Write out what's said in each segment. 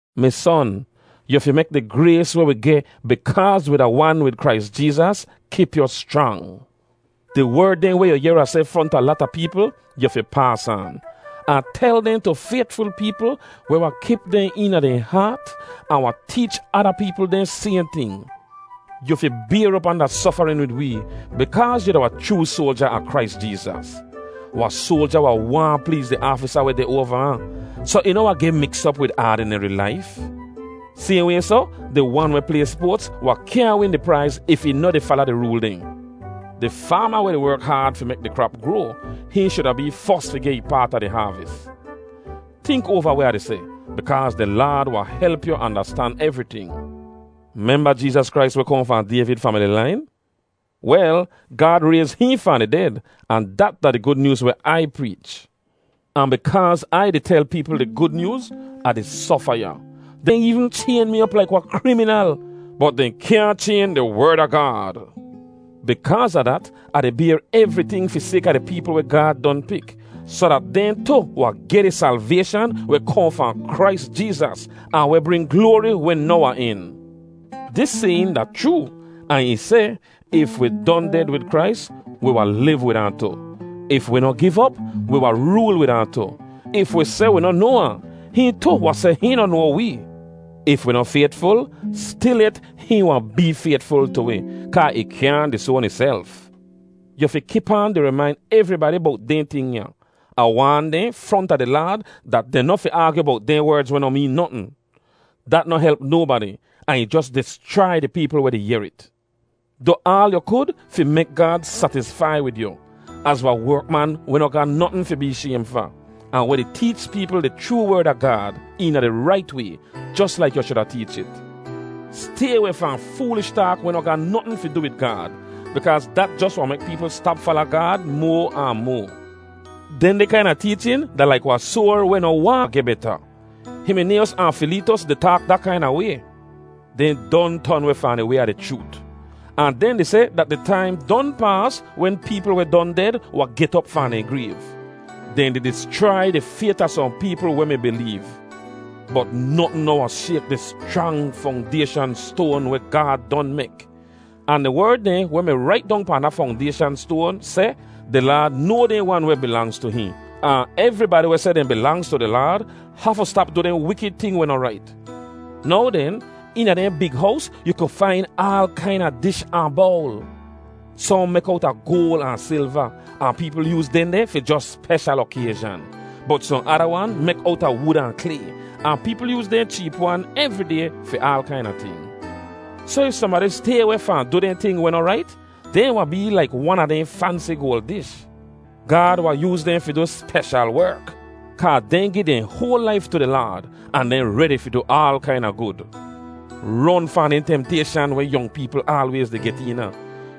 Mi son, yu fi mek di grays weh wi geh bikaaz wi da wan wid Krais Jeezas kip yu schrang. Di werd dehn weh yu yehr Ah seh fronta lata peepl, yu fi paas aan, ahn tel dehn tu faytful peepl weh wahn kip dehn eena dehn haat ahn wahn teech ada peepl dehn sayhn ting. Yu fi bayr op anda sofarin wid wee bikaaz yu da wahn chroo soalja a Krais Jeezas. Wahn soalja wahn waahn pleez di aafisa weh deh oava ahn, soh ih noh wahn geh miks op wid aadineri laif. Sayhn way soh, di wan weh play spoats wahn kyaahn win di praiz if ih noh di fala di rool dehn. Di faama weh di werk haad fi mek di krap groa, hihn shuda bee fos fi geh ih paat a di haavis. Tink oava weh Ah di seh, bikaaz di Laad wahn help yu andastan evriting. Memba Jeezas Krais weh kohn fahn Dayvid famili lain? Wel, Gaad rayz hihn fahn di ded, ahn dat da di Gud Nyooz weh Ai preech. Ahn bikaaz Ai di tel peepl di Gud Nyooz, Ah di sofa ya. Dehn eevn chayn mi op laik wahn kriminal. Bot dehn kyaahn chayn di Werd a Gaad. Bikaaz a dat, Ah di bayr evriting fi sayka di peepl weh Gaad don pik, soh dat dehn tu wahn geh di salvayshan weh kohn fahn Krais Jeezas ahn weh bring gloari weh noh wahn en. Dis sayin da chroo, ahn ih seh, If wi don ded wid Krais, wi wahn liv wid ahn tu. If wi noh giv op, wi wahn rool wid ahn tu. If wi seh wi noh noa ahn, hihn tu wahn seh hihn noh noa wee. If wi noh faytful, stilyet hihn wahn bee faytful tu wi, kaa ih kyaahn disoan ihself. Yu fi kip aan di rimain evribadi bowt dehn ting ya. Ahn waan dehn fronta di Laad dat dehn noh fi aagyu bowt dehn werdz weh noh meen notn. Dat noh help nobadi, ahn ih jos dischrai di peepl weh di yehr it. Du aal yu kud fi mek Gaad satisfai wid yu, az wahn werkman weh noh ga notn fi bee shaym fa, ahn weh di teech peepl di chroo Werd a Gaad, eena di rait way, jos laik yu shuda teech it. Stay weh fahn foolish taak weh noh ga notn fi du wid Gaad, bikaaz dat jos wahn mek peepl stap fala Gaad moa ahn moa. Dehndeh kaina teechin da laik wahn soar weh noh waahn geh beta. Himinayos ahn Fileetos di taak da kaina way. Dehn don ton weh fahn di way a di chroot, ahn dehn di seh dat di taim don paas wen peepl weh don ded wahn get op fahn dehn grayv. Dehn di dischrai di fayt a sohn peepl weh mi bileev. Bot notn noh wahn shayk di schrang fongdayshan stoan weh Gaad don mek. Ahn di werd dehn weh mi rait pahn da fongdayshan stoan seh, “Di Laad noa dehn wan weh bilangz tu hihn,” ahn “Evribadi weh seh dehn bilangz tu di Laad hafu stap du dehn wikid ting weh noh rait.” Now den, eena dehn big hows yu ku fain aal kaina dish ahn bowl. Sohn mek owta goal ahn silva, ahn peepl yooz dehndeh fi jos speshal okayzhan. Bot sohn ada wan mek owta wud ahn klay, ahn peepl yooz dehn cheep wan evri day fi aal kaina ting. Soh if sohnbadi stay weh fahn du dehn ting weh noh rait, dehn wahn bee laik wan a dehn fansi goal dish. Gaad wahn yooz dehn fi du speshal werk, kaa dehn gi dehn hoal laif tu di Laad, ahn dehn redi fi du aal kaina gud. Ron fahn dehn temtayshan weh yong peepl aalwayz di get eena.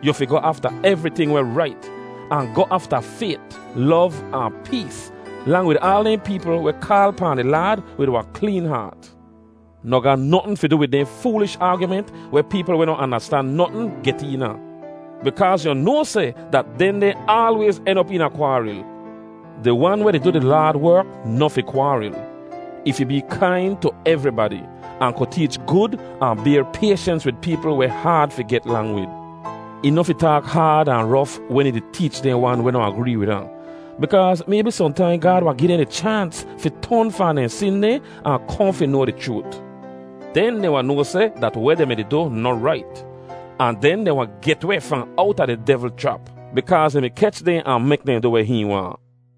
Yu fi goh afta evriting weh rait, ahn goh afta fayt, lov ahn pees, lang wid aal dehn peepl weh kaal pahn di Laad wid wahn kleen haat. Noh ga notn fi du wid dehn foolish aagyument weh peepl weh noh andastan notn get eena, bikaaz yu noa seh dat dehndeh aalwayz en op eena kwaaril. Di wan weh di du di Laad werk noh fi kwaaril. Ih fi bee kain tu evribadi, ahn ku teech gud ahn bayr payshens wid peepl weh haad fi get lang wid. Ih noh fi taak haad ahn rof wen ih di teech dehn wan weh noh agree wid ahn. Bikaaz maybi sohntaim Gaad wahn gi dehn di chaans fi ton fahn dehn sin dehn ahn kohn fi noa di chroot. Den dehn wahn noa seh dat weh dehn mi du noh rait. Ahn den dehn wahn get weh fahn owta di devl chrap, bikaaz ih mi kech dehn ahn mek dehn du weh hihn waahn.